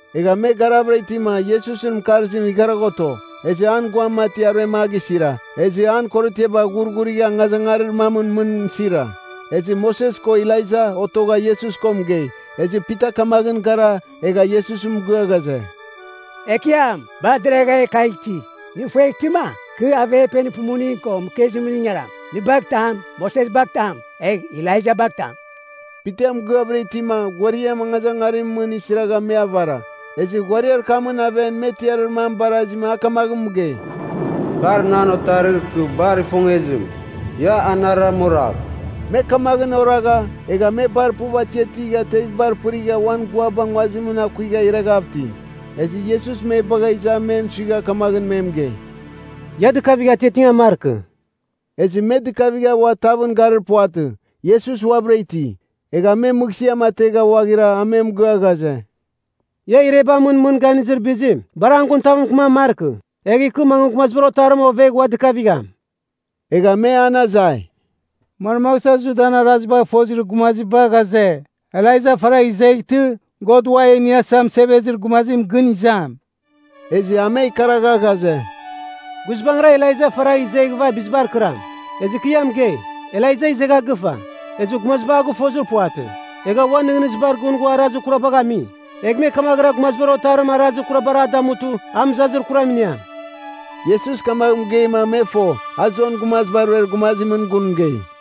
Egha me garavɨra itima, Iesusɨn mɨkarzim igharagha oto. Ezɨ an guam mati aruem a gisira, ezɨ an korotiaba ghurghurigha angazangarir mamɨn mɨn sira. Ezɨ Moses ko Elaija otogha Iesus ko mɨgei. Ezɨ Pita kamaghɨn gara, egha Iesus mɨgɨa ghaze, “Ekiam, bar deragha e kagh iti! Nɨ ifueghtɨma, kɨ averpenir pumuning ko mɨkezimɨn ingaram. Nɨ bagh tam, Moses bagh tam, egh Elaija bagh tam.” Pita mɨgɨavɨra itima, ghuariam angazangarimɨn mɨn isiragha me avara. Ezɨ ghuariar kamɨn aven me tiarir mam barazima a kamaghɨn mɨgei, “Kar nan Otarir kɨ bar ifongezim. Ia anarɨram oragh!” Me kamaghɨn oragha, egha me bar puv atiatigha tevibar pɨrigha uan guaba nguazimɨn akuigha ireghav iti. Ezɨ Iesus me bagha iza men suigha kamaghɨn me mɨgei, “Ia dɨkafigh atiatingan markɨ.” Ezɨ me dɨkavigha ua tavɨn garir puvatɨ, Iesus uabɨra iti. Egha me mɨghsɨam ategha ghuaghira a me mɨgɨa ghaze, “Ia irebamɨn mɨn ganizir bizim, bar an gun tav mɨkɨman markɨ. Egh ikɨ mangɨ Gumazibar Otarim ovegh ua dɨkavigham.” Egha me an azai, “Manmagh sua Judan arazibagh fozir gumaziba ghaze, Elaija faragh izeghtɨ, God Ua e Iniasa Mɨsevezir Gumazim gɨn izam?” Ezɨ a me ikaragha ghaze, “Guizbangɨra Elaija faragh izeghɨva bizibar kɨram. Ezɨ kɨ ia mɨgei, Elaija izegha gɨfa. Ezɨ gumaziba a gɨfozir puvatɨ, egha uan nɨghnɨzibar gɨn ghua arazir kurabar a gami. Egh me kamaghɨra Gumazibar Otarim arazir kurabar a damutɨ, a mɨzazir kuram iniam.” Iesus kamagh mɨgeima me fo, a Jon Gumaziba Ruer gumazimɨn gun mɨgei.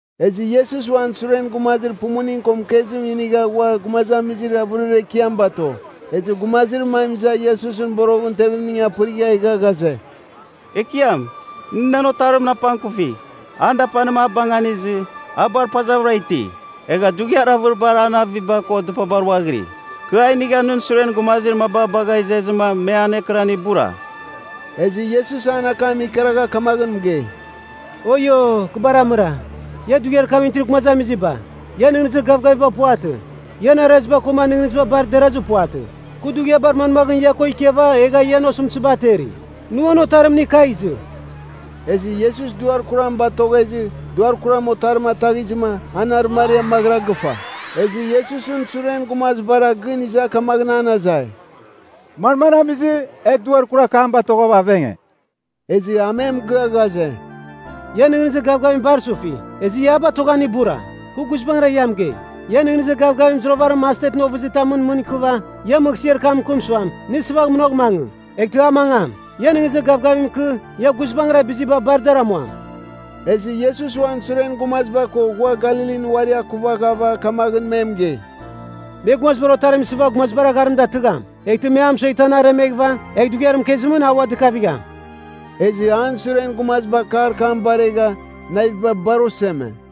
Ezɨ Iesus uan suren gumazir pumuning ko mɨkezim inigha ghua gumazamizir avɨrir ekiam bato. Ezɨ gumazir mam iza Iesusɨn boroghɨn tevimning apɨrigha egha ghaze, “Ekiam, nɨ nan otarimɨn apangkufigh. An dapanim abanganizɨ, a bar pazavɨra iti. Egha dughiar avɨriba an aviba ko dɨpabar ghuaghiri. Kɨ a inigha nɨn suren gumazir maba bagha izezɨma me anekɨran ibura.” Ezɨ Iesus an akam ikaragha kamaghɨn mɨgei, “Oio, kɨ bar amɨra, ia dughiar kamɨn itir gumazamiziba, ian nɨghnɨzir gavgaviba puvatɨ, ian araziba koma nɨghnɨziba bar derazir puvatɨ. Kɨ dughiabar manmaghɨn ia ko ikiava egha ian osɨmtɨziba ateri? Nɨ uan otarim inigh kagh izɨ.” Ezɨ Iesus duar kuram batoghezɨ, duar kuram otarim ataghizɨma, an arɨmariam maghɨra gɨfa. Ezɨ Iesusɨn suren gumazibara gɨn iza kamaghɨn an azai, “Manmagh amizɨ, e duar kurar kam batoghava avenge?” Ezɨ a me mɨgɨa ghaze, “Ian nɨghnɨzir gavgavim bar sufi, ezɨ ia a batoghan ibura. Kɨ guizbangɨra ia mɨgei, ian nɨghnɨzir gavgavim zuravarim mastetɨn ovɨzitamɨn mɨn ikɨva, ia mɨghsɨar kam mɨkɨm suam, nɨ sɨvagh munagh mangɨ, eghtɨ a mangam. Ia nɨghnɨzir gavgavim ikɨ, ia guizbangɨra biziba bar dar amuam.” Ezɨ Iesus uan suren gumaziba ko ghua Galilin uari akuvaghava kamaghɨn me mɨgei, “Me Gumazibar Otarim isɨva gumazibar agharim datɨgham. Eghtɨ me a mɨsueghtɨ an aremeghɨva, egh dughiar mɨkezimɨn a ua dɨkavigham.” Ezɨ an suren gumaziba akar kam baregha, naviba bar oseme.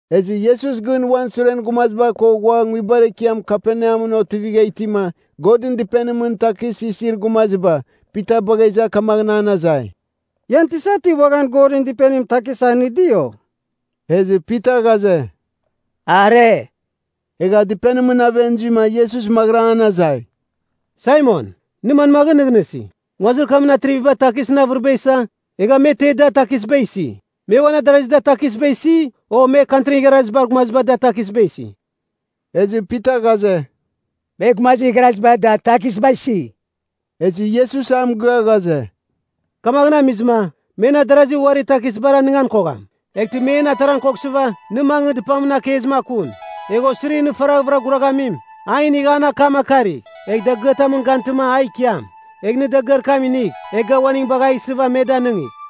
Ezɨ Iesus gɨn uan suren gumaziba ko ghua nguibar ekiam Kaperneamɨn otivigha itima, Godɨn Dɨpenimɨn takis isir gumaziba, Pita bagha iza kamaghɨn an azai, “Ian tisa ti uaghan Godɨn Dɨpenimɨn takis anɨdi, o?” Ezɨ Pita ghaze, “Are.” Egha dɨpenimɨn aven zuima, Iesus maghɨra an azai, “Saimon, nɨ manmaghɨn nɨghnɨsi? Nguazir kamɨn atriviba takisɨn avɨriba isa, egha me te da, takisba isi? Me uan adarazi da takisba isi, o me Kantrin igharazibar gumaziba da takisba isi?” Ezɨ Pita ghaze, “Me gumazir igharaziba da takisba isi.” Ezɨ Iesus a mɨgɨa ghaze, “Kamaghɨn amizɨma, men adarazi uari takisbar anɨngan kogham. Eghtɨ me en ataran koghsɨva, nɨ mangɨ dɨpamɨn akezim akun. Egh osirir nɨ faraghvɨra guraghamim, a inigh an akam akarigh, egh dagɨatamɨn gantɨma a ikiam. Egh nɨ dagɨar kam inigh, egh ga uaning bagh a isɨva me danɨngigh.”